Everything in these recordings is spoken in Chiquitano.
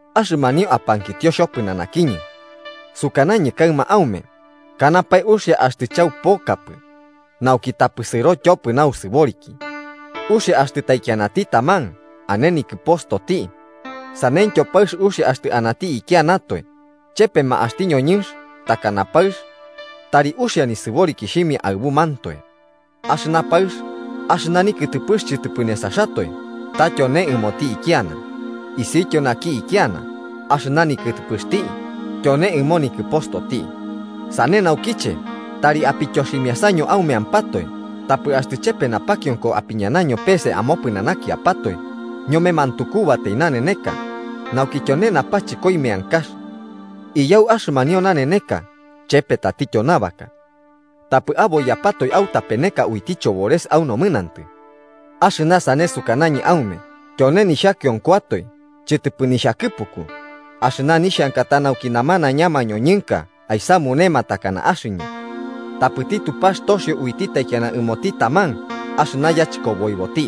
Axɨmanio apankitio xhopɨnanakiñɨ sukanañɨ kaɨma aume. Kanapae uxia axtɨ chaupokapɨ. Nauki tapɨ sɨro tyopɨ nausɨboriki, uxia axtɨ taikianati taman ane nikɨpostoti, saneityo paɨx uxia axtɨ anati ikianatoe. Chepema axti ñoñɨnx takana paɨx tari uxia nisɨborikixhimia aɨbumantoe. Axɨna paɨx, axɨna nikɨtɨpɨx chɨtɨpɨ nesaxatoe, ta tyone ɨmoti ikiana, isiutityo naki ikiana, axɨna nikɨtɨpɨxti tyone ɨmo nikɨpostoti. Sane naukiche, tari apityoximiasaño aumeampatoe, tapɨ axtɨ chepe napakionko apiñanaño pese amopɨnanakiapatoe ñome mantukubatai naneneka nauki tyone napachɨkoi meankax. Iyau axɨmanio naneneka chepe tatityo nabaka. Tapɨ aboiyapatoe autapeneka uiti chobores au nomɨnantɨ. Axɨna sane sukanañɨ aume tyone nixhakionkoatoe chɨtɨpɨ nixhakɨpuku. Axɨna nixhanka ta nauki namanaiña mañoñɨnka aisamunema takana axɨñɨ. Tapɨti Tupax toxio uiti taikiana ɨmoti taman axɨna yachɨkoboiboti.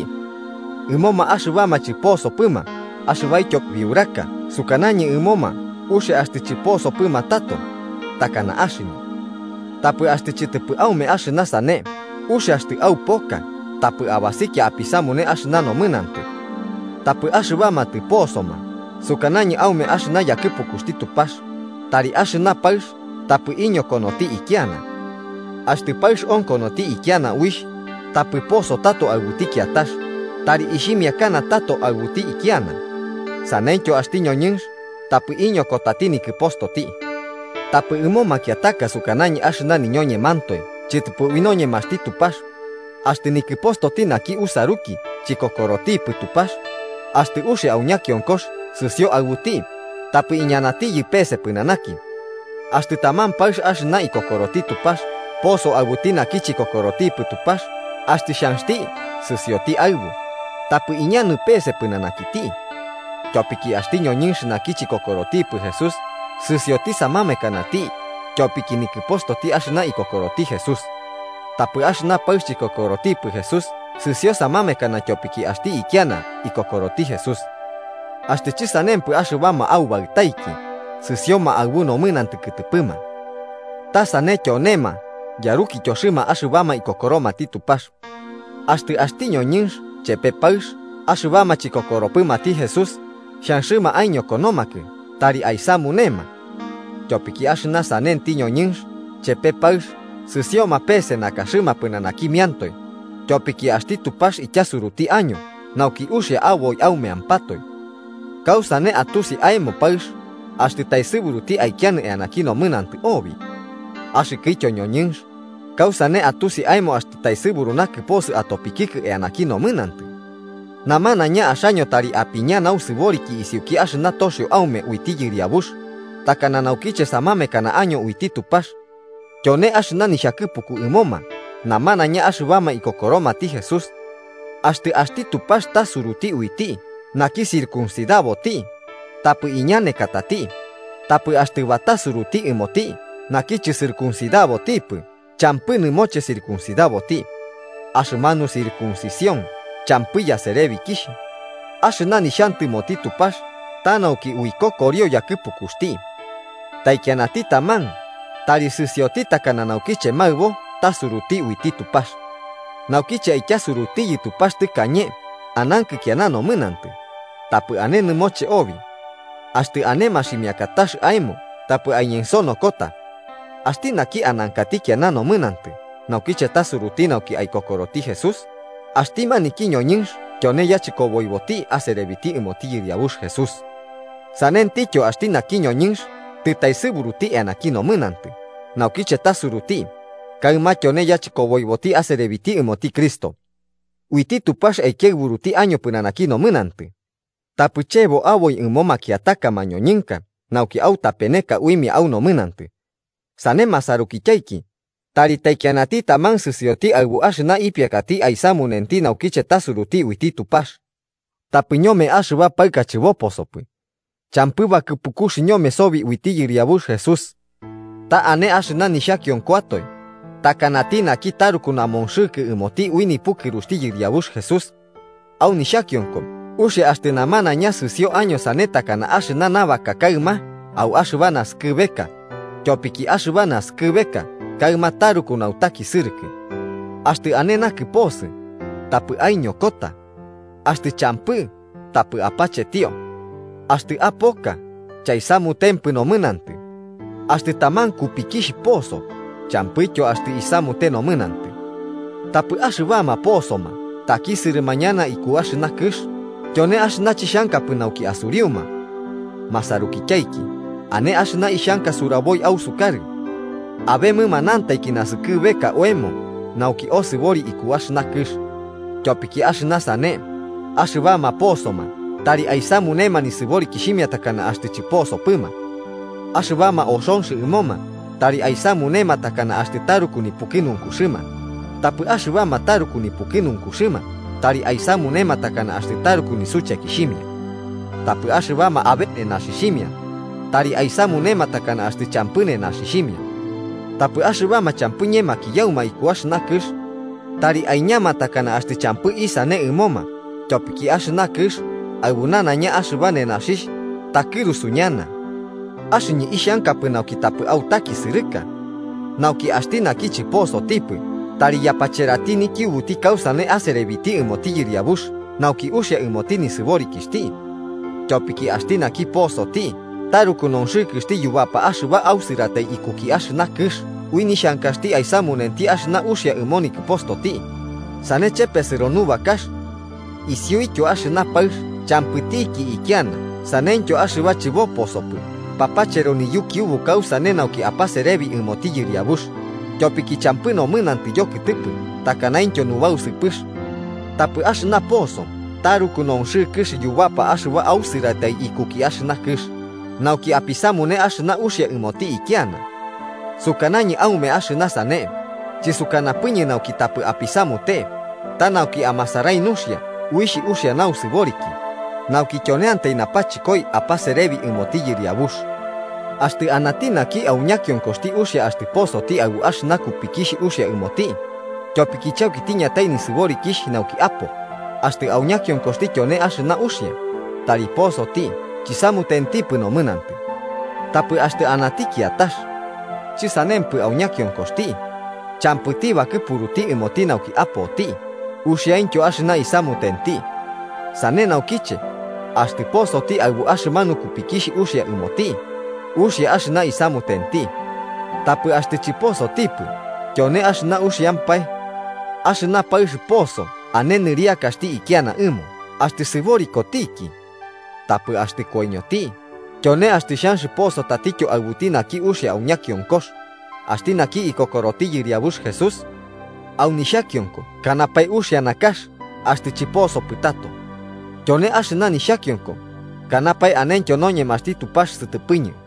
Ɨmoma axɨbama chɨposopɨma axɨbaityo biuraka sukanañɨ ɨmoma uxia axtɨ chɨposopɨma tato, takana axɨñɨ. Tapɨ axtɨ chɨtɨpɨ aume axɨna sane, uxia axtɨ aupoka tapɨ abasikia apisamune axɨna nomɨnantɨ. Tapɨ axɨbama tɨposoma sukanañɨ aume axɨna yakɨpukuxti Tupax, tari axɨna paɨx tapɨ iñokonoti ikiana. Axtɨ paɨx okonoti ikiana uixh, tapɨ poso tato aɨbuti kiatax, tari aixhimiaka tato aɨbuti ikiana. Saneityo axti ñoñɨnx tapɨ iñokotati nikɨpostoti. Tapɨ ɨmo makiataka sukanañɨ axɨna niñoñemantoe chɨtɨpɨ ui noñemaxti Tupax, axtɨ nikɨpostoti naki usaruki chikokorotipɨ Tupax, axtɨ uxia au ñakionkox sɨsio aɨbuti, tapɨ iñanatiyɨ pese pɨnanaki. Axtɨ taman paɨx axɨna ikokoroti Tupax poso aɨbuti naki chikokorotipɨ Tupax axtɨ xhanxti sɨsioti aɨbu, tapɨ iñanɨ pese pɨnanakiti. Tyopiki axti ñoñɨnx naki chikokorotipɨ Jesús sɨsioti samamekanati tyopiki nikɨpostoti axɨna ikokoroti Jesús. Tapɨ axɨna paɨx chikokorotipɨ Jesús sɨsio samamekana tyopiki axti ikiana ikokoroti Jesús. Axtɨ chɨsanempɨ axɨbama aubaɨtaiki sɨsioma aɨbu nomɨnantɨ kɨtɨpɨma. Ta sane tyonema yarukityoxɨma axɨbama ikokoromati Tupax. Axtɨ axti ñoñɨnx chepe paɨx axɨbama chikokoropɨmati Jesús xhanxɨma aiñokonomakɨ tari aisamunema. Tyopiki axɨna sanenti ñoñɨnx chepe paɨx sɨsioma pese nakaxɨma pɨnanakimiantoe, tyopiki axti Tupax ityasuruti año nauki uxia aboi aumeampatoe. ¿Kausane atusi aemo paɨx, axtɨ taesɨburuti aikianɨ eanaki nomɨnantɨ obi? Axɨkɨtyo ñoñɨnx, ¿kausane atusi aemo axtɨ taesɨburu nakɨposɨ atopikikɨ eanaki nomɨnantɨ? Namanaiña axaño tari apiña nausɨboriki isiuki axɨna toxio aume uiti Yɨriabux, takana naukiche samamekana año uiti Tupax. Tyone axɨna nixhakɨpuku ɨmoma namanaiña axɨbama ikokoromati Jesús. Axtɨ axti Tupax tasuruti uiti naki circuncidaboti, tapɨ iñanekatati, tapɨ axtɨ batasuruti ɨmoti naki chɨcircuncidabotipɨ champɨ nɨmoche circuncidaboti. Axɨmanu circuncición champɨ yaserebikixh, axɨna nixhantɨmoti Tupax ta nauki uikokorio yakɨpukuxti. Taikianati taman tari sɨsioti takana naukiche maɨbo tasuruti uiti Tupax. Naukiche aityasurutiyɨ Tupax tɨkañe anankɨ kiana nomɨnantɨ, tapɨ ane nɨmoche obi. Axtɨ ane maximiakatax aemo tapɨ aiñensonokota. Axti naki anankati kiana nomɨnantɨ naukiche tasuruti nauki aikokoroti Jesús, axti maniki ñoñɨnx tyone yachɨkoboiboti aserebiti ɨmoti Yɨriabux Jesús. Sanentityo axti naki ñoñɨnx tɨtaesɨburuti eanaki nomɨnantɨ naukiche tasuruti, kaɨma tyone yachɨkoboiboti aserebiti ɨmoti Cristo. Uiti Tupax aikiaɨburuti año pɨnanaki nomɨnantɨ. Tapɨ chebo aboi ɨmoma makiataka mañoñɨnka nauki autapeneka uimia au nomɨnantɨ. Sane masarukityaiki, tari taikianati taman sɨsioti aɨbu axɨna ipiakati aisamunenti naukiche tasuruti uiti Tupax. Tapɨ ñome axɨba paɨka chɨboposopɨ, champɨ bakɨpukux ñome sobi uiti Yɨriabux Jesús. Ta ane axɨna nixhakionkoatoe, takanati naki taruku namonxɨkɨ ɨmoti ui nipukɨruxti Yɨriabux Jesús. Au nixhakionko uxia axtɨ namanaiña sɨsio año sane takana axɨna nabaka kaɨma au axɨba naskɨbeka, tyopiki axɨba naskɨbeka kaɨma taruku nutakisɨrɨkɨ. Axtɨ ane nakɨposɨ, tapɨ aiñokota. Axtɨ champɨ, tapɨ apachetio. Axtɨ apoka, chaisamutempɨ nomɨnantɨ. Axtɨ taman kupikixh poso, champɨityo axtɨ isamute nomɨnantɨ. Tapɨ axɨbama posoma takisɨrɨma ñana iku axɨna kɨx, tyone axɨna chixhankapɨ nauki asuriuma. Masarukityaiki, ane axɨna ixhanka suraboi ausukarɨ: Abe mɨmanantaiki naskɨbeka oemo nauki osɨbori iku axɨna kɨx. Tyopiki axɨna sane, axɨbama posoma tari aisamunema nisɨborikixhimia takana axtɨ chɨposopɨma. Axɨbama oxonx ɨmoma tari aisamunema takana axtɨ taruku nipukɨnunkuxɨma, tapɨ axɨbama taruku nipukɨnunkuxɨma tari aisamunema takana axtɨ taruku nisuchekixhimia. Tapɨ axɨbama abe nenaxixhimia tari aisamunema takana axtɨ champɨ nenaxixhimia. Tapɨ axɨbama champɨ ñemakiyauma iku axɨna kɨx, tari aiñama takana axtɨ champɨ isane ɨmoma, tyopiki axɨna kɨx aɨbu nanaiña axɨba nenaxixh takɨrusu ñana. Axɨñɨ ixhankapɨ nauki tapɨ autakisɨrɨka. Nauki axti naki chɨposotipɨ tari yapacherati nikiubuti kausane aserebiti ɨmoti Yɨriabux nauki uxia ɨmoti nisɨborikixhti. Tyopiki axti naki posoti taruku nonxɨkɨxti yubapa axɨba ausɨratai ikuki axɨna kɨx ui nixhankaxti aisamunenti axɨna uxia ɨmo nikɨpostoti, sane chepesɨro nubakax. Isiuityo axɨna paɨx champɨtiki ikiana saneityo axɨba chɨboposopɨ papachero niyukiubu kausane nauki apaserebi ɨmoti Yɨriabux, tyopiki champɨ nomɨnantɨ yokɨtɨpɨ takanaintyo nubausɨpɨx. Tapɨ axɨna poso taruku nonxɨkɨx yubapa axɨba ausɨratai ikuki axɨna kɨx, nauki apisamune axɨna uxia ɨmoti ikiana. Sukanañɨ aume axɨna sane, chɨsukanapɨñɨ nauki tapɨ apisamute, ta nauki amasarai nuxia uixh uxia nausɨboriki, nauki tyoneantai napachɨkoi apaserebi ɨmoti Yɨriabux. Axtɨ anati naki au ñakionkoxti uxia axtɨ posoti aɨbu axɨna kupikixh uxia ɨmoti, tyopiki chauki tiñatai nisɨborikixh nauki apo, axtɨ au ñakionkoxti tyone axɨna uxia, tari posoti chisamutentipɨ nomɨnantɨ. Tapɨ axtɨ anati kiatax, chɨsanempɨ au ñakionkoxti, champɨti bakɨpuruti ɨmoti nauki apoti, uxiaintyo axɨna isamutenti. Sane naukiche, axtɨ posoti aɨbu axɨmanu kupikixh uxia ɨmoti, uxia axɨna isamutenti. Tapɨ axtɨ chɨposotipɨ, tyone axɨna uxiampae. Axɨna paɨx poso ane nɨriakaxti ikiana ɨmo axtɨ sɨborikotiki. Tapɨ axtɨ koiñoti, tyone axtɨ xhanx poso tatityo aɨbuti naki uxianti au ñakionkox, axti naki ikokoroti Yɨriabux Jesús. Au nixhakionko kanapae uxia nakax axtɨ chɨposopɨ tato. Tyone axɨna nixhakionko, kanapae anentyo noñemaxti Tupax sɨtɨpɨñɨ